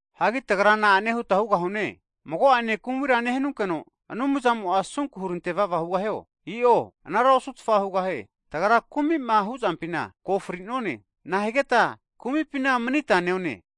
Hagi tagra na'ane huta hugahune, mago'ane kumira nehanunkeno Anumzamo'a asunku hurantevava hugahio? I'o anara osutfa hugahie. Tagra kumi'ma huzampina ko fri'none, nahanigeta kumipina manita neone?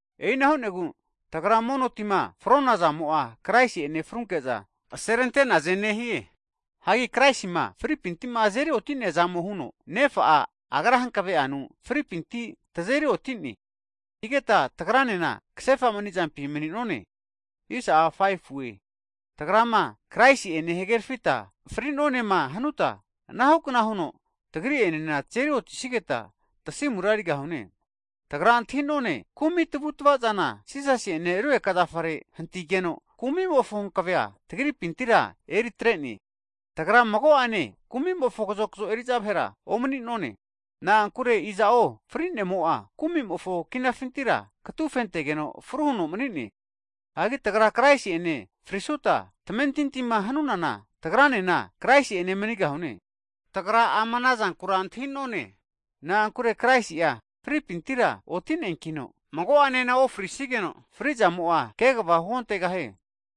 E'ina hu'negu tagra mono tima fronazamo'a, Kraisi'ene frunke'za aserente'naze nehie. Hagi Kraisima fripinti'ma azeri oti'neaza huno, Nefa'a Agra'a hankave'anu Kraisi'enema fri'nompintira tazeri oti'neankita, tagranena kasefa manizampi Kraisi'ene maninunku anara hu'ne. Tagrama Kraisi'ene hagerafita fri'nonema hanuta, anahukna huno tagri'enena tazeri'otisigeta tasimura erigahune. Tagra antahi'none kumi tavutavazana Jisasi'ene rugeka zafare hanti'neana, kumimofo hankavea tagripina omanesiegu anara hu'ne. Tagra mago'ane kumimofo kazokzo eri'za vahera omani'none. Na'ankure iza'o fri'nemo'a, kumimofo kinafintira katufentegeno fru huno mani'ne. Hagi tagra Kraisi'ene frinesuta, tamentintima hunana tagranena Kraisi'ene manigahune. Tagra ama ana zankura antahi'none. Na'ankure Kraisi'a fripintira oti'neankino, mago'anena ofrisigeno fri'zamo'a kegava huontegahie.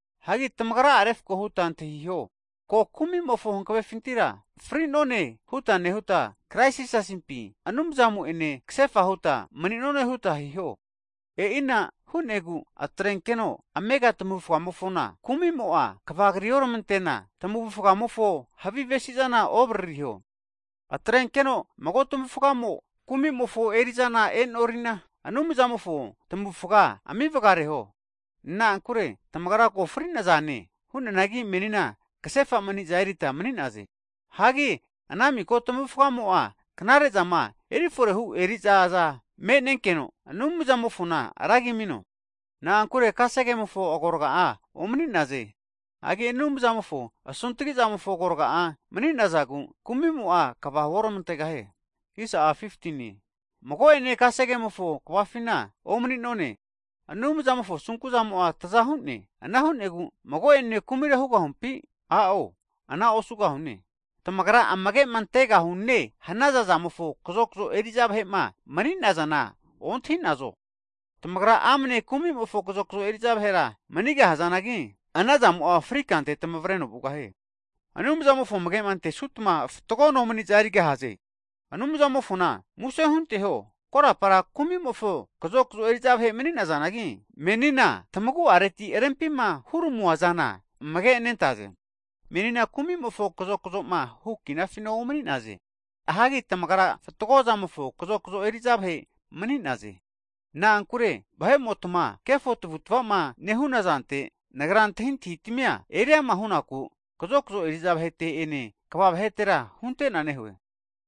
Hagi tamagra'a refko huta antahiho, ko kumimofo hankavefintira fri'none huta nehuta, Krais Jisasimpi, Anumzamo'ene kasefa huta mani'none huta hiho. E'ina hu'negu atrenkeno amega tamavufgamofona kumimo'a kvagrioramantena, tavufgamofo havi avesizana ovaririho. Atrenkeno mago tmavufgamo kumimofo eri'zana e'norina, Anumzamofo tamavufga ami vagareho. Na'ankure tamagra ko fri'nazane, hu'neanagi menina kasefa maniza erita mani'naze. Hagi ana miko tamavufgamo'a knare'zama eriforehu erizaza me'nenkeno, Anumzamofona ragi amino. Na'ankure kasegemofo agorga'a omani'naze. Hagi Anumzamofo asuntgi zamofo agorga'a mani'nazagu, kumimo'a kva huormantegahie. Mago'ene kasegemofo kvafina omani'none. Anumzamofo asunku'zamo taza hu'ne. Ana hu'negu mago'ene kumira hugahumpi? A'o, ana osugahune. Tamagra amage antegahune hanaza zamofo kazokzo eri'za vahe'ma mani'nazana ontahi'nazo? Tamagra amne kumimofo kazokzo eri'za vahera manigahazanagi, ana zamo fri kante tamavreno vugahie. Anumzamofo amage antesutma fatgo nomaniza erigahaze. Anumzamofona muse hunteho, korapara kumimofo kazokzo eri'za vahe mani'nazanagi, menina tamagu'areti rempima huramuazana amage'nentaze. Menina kumimofo kazokzoma hu' kinafina omani'naze. Hagi tamagra fatgo avu'avazamofo kazokzo eri'za vahe mani'naze. Na'ankure vahe'motama kefo tavu'tvama nehuna zante nagra antahintahitamia eriama hu'naku kazokzo eri'za vahete'ene kva vahetera hunte'na nehue.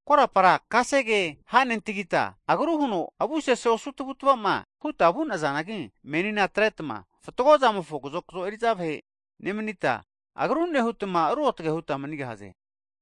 Korapara kasege ha'nentagita agru huno avu sese osu tamavutamava huta vu'nazanagi, menina atretma fatgozamofo kazokzo eri'za vahe nemanita, agru nehutma ruotge huta manigahaze.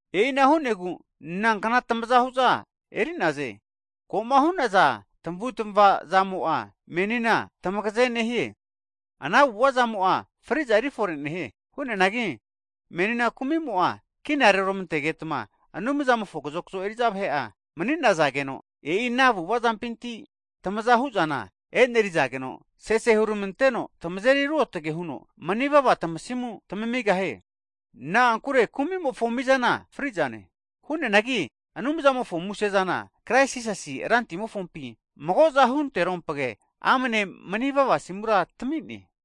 E'ina hu'negu nankna tamazahuza eri'naze? Ko'ma hu'naza tamavutamava zamo'a menina tamagaze nehie. Ana avu'avazamo'a fri'za erifore nehie. Hu'neanagi menina kumimo'a kina reoramantegetma, Anumzamofo kazokzo eri'za vahe'a mani'nazageno, e'i ana avu'avazampinti tamazahu'zana enerizageno, sese huramanteno tamazeri ruotage nehiankino, manivava tamasimu tamamigahie. Na'ankure kumi'mofo mizana fri'zane. Hu'neanagi Anumzamofo muse'zana, Krais Jisasi Rantimofompi mago'za hunterompge, amne manivava asimura tami'ne.